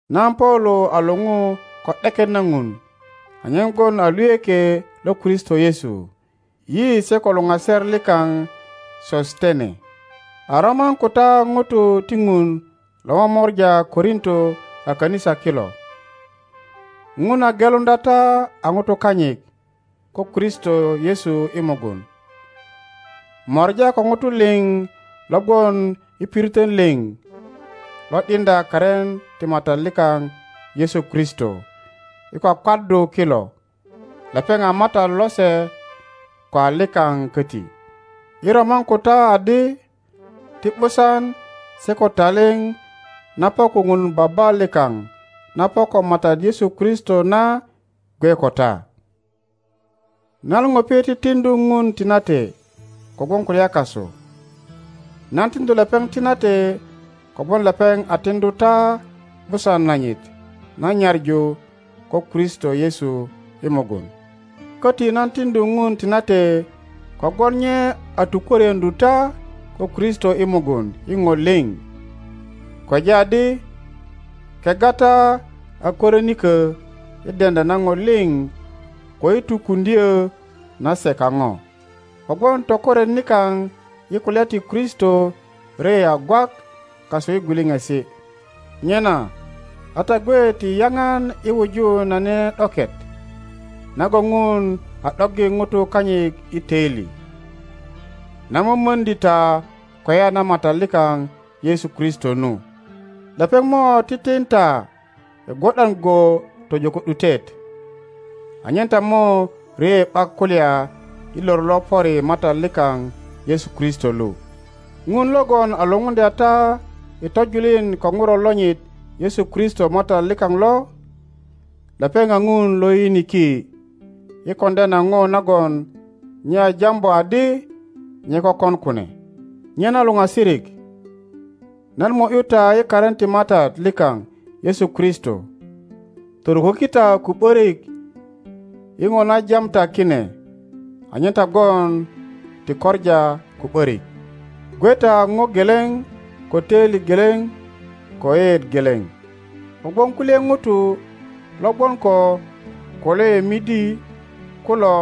Nan Paulo a luŋu ko ’deket na Ŋun anyen gwon a luyökie lo Kristo Yesu. Yi se ko luŋaser likaŋ Sosetene a roman ko ta ŋutu ti Ŋun lo momora Korinto a kanisa kilo. Ŋun a geluŋdya ta a Ŋutu kanyit ko Kristo Yesu i mugun, mora ko Ŋutu liŋ lo gwon i piritön liŋ lo ’diŋdya karin ti Matat likaŋ Yesu Kristo i kwakwaddu kilo. Lepeŋ a Matat lose ko a likaŋ koti. Yi roman ko ta adi, Ti ’busan se ko talip na po ko Ŋun Baba likaŋ na po ko Matat Yesu Kristo na gwe ko ta. Nan ŋupi titiŋdu Ŋun tinate kogwon kulya kasu. Nan tiŋöju lepeŋ tinate kogwon lepeŋ a tiŋdu ta ’busan nanyit na nyaŋu ko Kristo Yesu i mugun. Koti nan tiŋdu Ŋun tinate kogwon nye a tukwörieŋöju ta ko Kristo i mugun i ŋo liŋ. Kweja adi kegga ta a kwörinikö i deŋdya na Ŋo liŋ ko i tukuŋdyo na se kaŋo, kogwon tokoret nikaŋ i kulya ti Kristo rye a gwak kasu i gwiliŋisi. Nyena a ta gwe ti yaŋan i wuju na nene ’doket nagon Ŋun a ’doggi Ŋutu kanyit i toili, na momordi ta kweya na Matat likaŋ Yesu Kristo nu. Lepeŋ mo titin ta i gwo ’dan go tojo ko ’dutet, anyen ta mo rye ’bak kulya i lor lo pöri Matat likaŋ Yesu Kristo lu. Ŋun logon a lupuŋdya ta i tojulin ko Ŋuro lonyit Yesu Kristo Matat likaŋ lo, lepeŋ a Ŋun lo yiyiniki i koŋdya na ŋo nagon nye a jambu adi nye kökon kune. Nyena luŋasirik, nan mo ’yu ta i karin ti Matat likaŋ Yesu Kristo, toruköki ta ko ’borik i ŋo na jam ta kine, anyen ta gwon ti koŋa ko ’borik. Gwe ta a ŋo geleŋ ko toili geleŋ ko yeyeet geleŋ. Kogwon kulye ŋutu logwon ko Kuloe midi kulo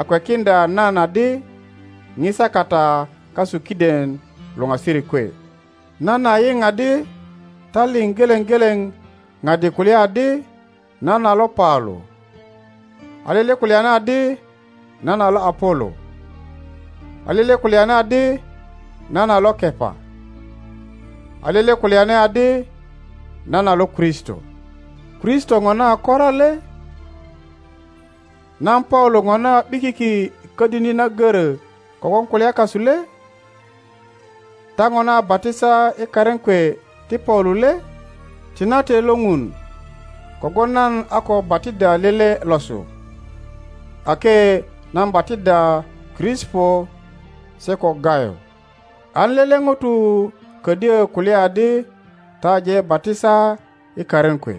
a kwekiŋdya nan adi ŋisa kata kasu kiden luŋasirik kwe. Nan a yiŋ adi ta liŋ geleŋ geleŋ ŋadi kulya adi, Nan a lo Paulo, a lele kulyani adi, Nan a lo Apolo, a lele kulyani adi, Nan a lo Kepa, a lele kulyani adi, Nan a lo Kristo. Kristo ŋona a kora le? Nan Paulo ŋona a ’bikiki i kodini na goro kogwon kulya kasu le? Ta ŋona a batisa i karin kwe ti Paulo le? Tinate lo Ŋun kogwon nan a ko batiddya lele losu, ake nan batiddya Krisipo se ko Gayo, an lele ŋuto kodyo kulya adi ta aje batisa i karin kwe.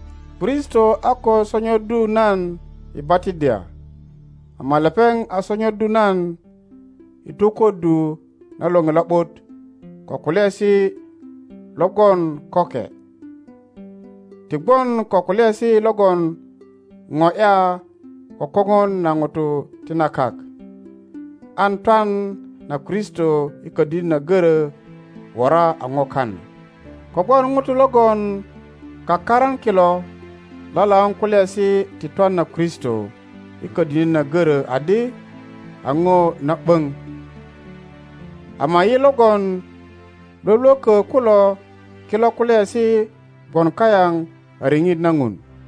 Kristo a ko sonyoddu nan i batiddya, ama lepeŋ a sonyoddu nan i tokuddu na Loŋe Lo ’but ko kulyaesi logon köke, ti gwon ko kulyaesi logon ŋo ’ya ko koŋon na ŋutu ti na kak, an twan na Kristo i kodini na goro wora a ŋo kana. Kogwon ŋutu logon kakaran kilo lalaun kulyaesi ti twan na Kristo i kodini na goro adi a ŋo na ’boŋ, ama yi logon lwölwökö kulo kilo kulyaesi gwon kayaŋ a riŋit na Ŋun.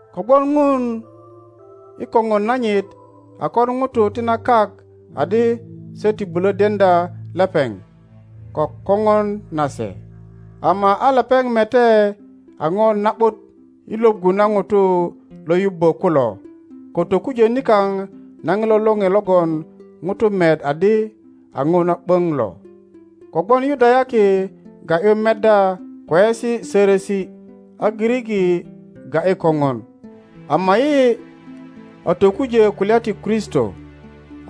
Kogwon Ŋun i koŋon nanyit a kon ŋutu ti na kak adi se ti bulo deŋdya lepeŋ ko koŋon nase, ama a lepeŋ mete a ŋo na ’but i Iwoggu na ŋutu lo yubbo kulo ko tokujö nikaŋ na ŋilo Loŋe logon ŋutu met adi a ŋo na ’böŋ lo. Kogwon Yudayaki ga ’yu meddya kweyesi sörösi, a Giriki ga ’yi koŋon, ama yi a tokujo kulya ti Kristo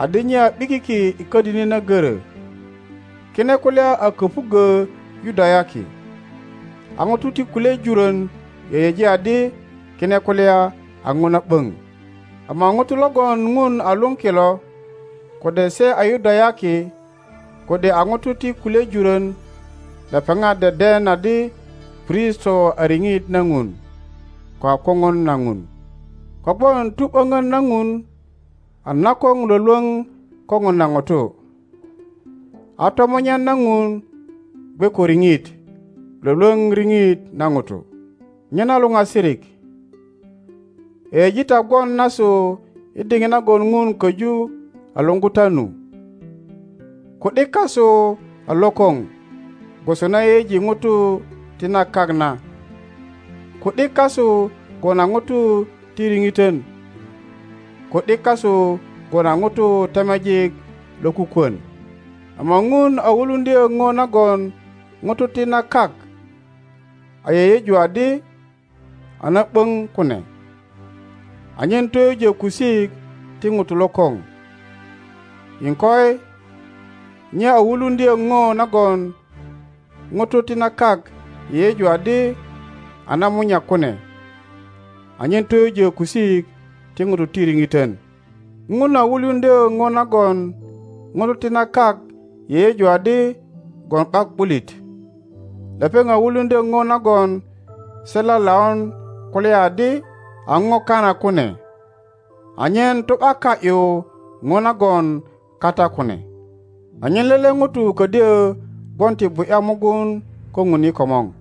adi nye a ’bikiki i kodini na goro. Kine kulya a köpuggö Yudayaki, a ŋuto ti kulye juron yeyeji adi kine kulya a Ŋo na ’boŋ, ama ŋutu logon Ŋun a lun kilo, kode se a Yudayaki kode a ŋutu ti kulye juron, lepeŋat deden adi Kristo a riŋit na Ŋun ko a koŋon na Ŋun. Kogwon tu ’bonon na Ŋun a nakoŋ lwölwoŋ kopon na Ŋutu, a tomunyan na Ŋun gwe ko riŋit Iwolwoŋ riŋit na Ŋutu. Nyena luŋasirik, yeyeji ta gwon nasu i diŋit nagon Ŋun koju a luŋgu ta nu. Ku ’dik kasu a lokoŋ gwoso na yeyeji Ŋutu ti na kak na, ku ’dik kasu gwon a ŋuto ti riŋitön, ku ’dik kasu gwon a Ŋutu temejik lokukwon. Ama Ŋun a wuluŋdyo Ŋo nagon ŋutu ti na kak a yeyeju adi a na ’boŋ kune anyen toyujo kusik ti Ŋutu lokoŋ, iŋkoi, nye a wuluŋdyo ŋo nagon Ŋutu ti na kak yeyeju adi a namunyak kune anyen toyujo kusik ti Ŋutu ti riŋiton. Ŋun a wuluŋdyo ŋo nagon Ŋutu ti na kak yeyeju adi gwon ’bak ’bulit, lepeŋ a wuluŋdyo ŋo nagon se lalaun kulya adi a ŋo kana kune, anyen tu ’baka ’yu ŋo nagon kata kune, anyen lele ŋuto kodyo gwon ti bu ’ya mugun ko Ŋun i komor.